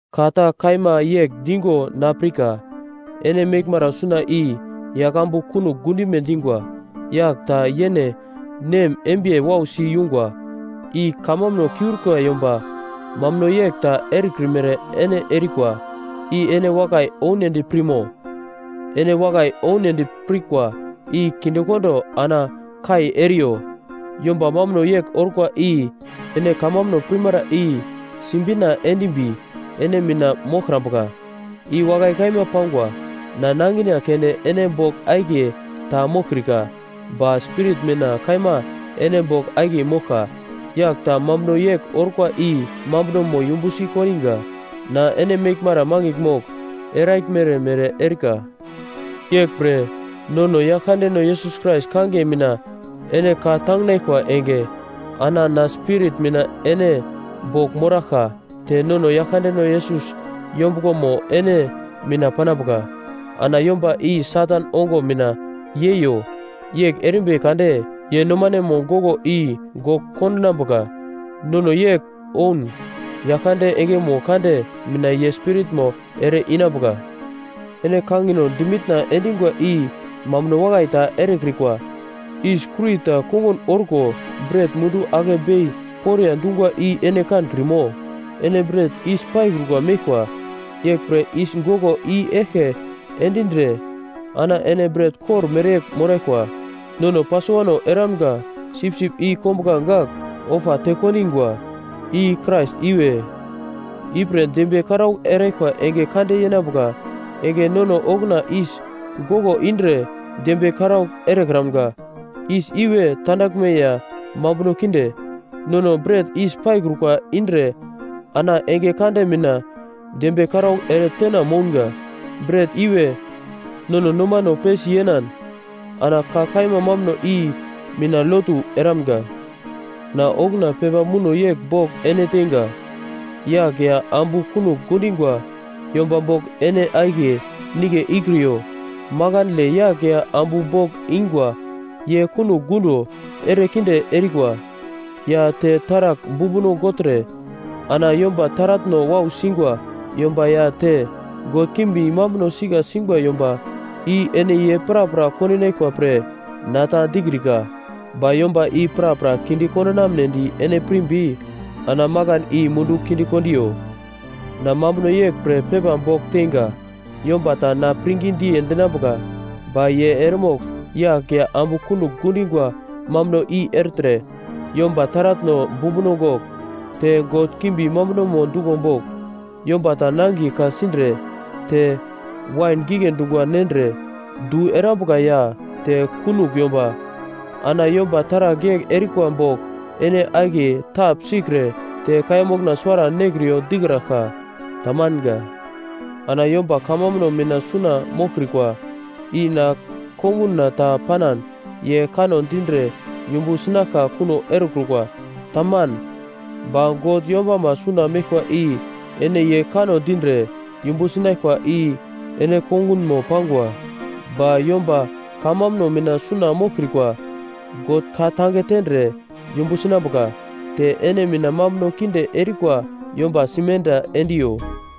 Ka ta kaima yegl dingo na pirka: Ene meglmara suna i yaglambu kunogl gundime dingwa. Yagl ta yene nem embiye wausi yungwa. I kamambuno kiurikwa yomba mambuno yegl ta erekrimere ene erikwa. I ene wakai ounedi pirmo? Ene wakai ounedi pirkwa i kindekondo ana kai eriyo. Yomba mambuno yegl orkwa i ene kamambuno pirmara i sibina endimbi ene mina moglkrambuka. I wakai kaima pangwa. Na nangina keunde ene bogl akiye ta moglkrika ba spirit mina kaima ene bogl akiye moglka. Yagl ta mambuno yegl orkwa i mambunomo yumbusi kondiga. Na ene meglmara mangigl mogl eraglmere mere erika. Yeglpre nono Yaglkandeno Yesus Krais kangiye mina ene ka tanginaglkwa enge, ana na spirit mina ene bogl moraglkwa te nono Yaglkandeno Yesus yombuglomo ene mina panambuka. Ana yomba i Satan ongo mina yeiyo, yegl erimbi kade ye nomanemo goglo i gogl kondinambuka. Nono yegl oun, Yaglkande engemo kande mina ye spiritmo ere-inambuka. Ene kangino dimitna endingwa i mambuno wakai ta erekrikwa. Yis kurita kongun orko bret mundu ake bei poriya dungwa i ene kankrimo? Ene bret yis paikrukwa meglkwa, yeglpre yis goglo i-eglke endindre ana ene bret kor mereyegl moraglkwa. Nono Pasovano eramga sipsip i kombuglange gagl ofa tekondingwa. I Krais iwe. Ipre dembiye karaugl eraglkwa enge kande yenambuka enge nono okuna yis goglo indre dembiye karaugl erekramga, yis iwe tandaglme ya mambuno kinde. Nono bret yis paikrukwa indre ana enge kande mina dembiye karaugl ere tena mounga. Bret iwe nono nomano pesi yenan ana ka kaima mambuno i mina lotu eramga. Na okuna pepa muno yegl bogl ene teinga, “Yagl ya ambu kunogl gundingwa yomba bogl ene akiye nigle ikriyo.” Makandle yagl ya ambu bogl ingwa ye kunogl gundo erekinde erikwa, ya te taragl bumbuno gogltre ana yomba taratno wau singwa yomba ya te god kimbi mambuno sika singwa yomba, i ene ye prapra kondinaglkwa pre na ta dikrika. Ba yomba i prapra kinde kondumnedi ene pirimbi ana makan i mundu kinde kondiyo. Na mambuno yegl pre pepa bogl teinga: Yomba ta na pirngi diye dinambuka, ba ye eremogl yagl ya ambu kunogl gundingwa mambuno i ertre, yomba taratno bumbuno gogl, te god kimbi mambunomo duglo bogl, yomba ta nangiye ka-sindre te wain gigle dungwa nendre du erambuka ya te kunogl yomba. Ana yomba taragl yegl erikwa bogl ene akiye tapsikre te kaiya mokna suwara nekriyo dikraglka. Tamanga. Ana yomba kamambuno mina suna moglkrikwa i na konguna ta panan ye kanno dindre yumbu sinaglka kuno erekrukwa. Taman. Ba God yombama suna meglkwa i ene ye kanno dindre yumbu sinaglkwa i ene kongunmo pangwa. Ba yomba kamambuno mina suna moglkrikwa God ka-tange tendre yumbu sinambuka. Te ene mina mambuno kinde erikwa yomba simenda endiyo!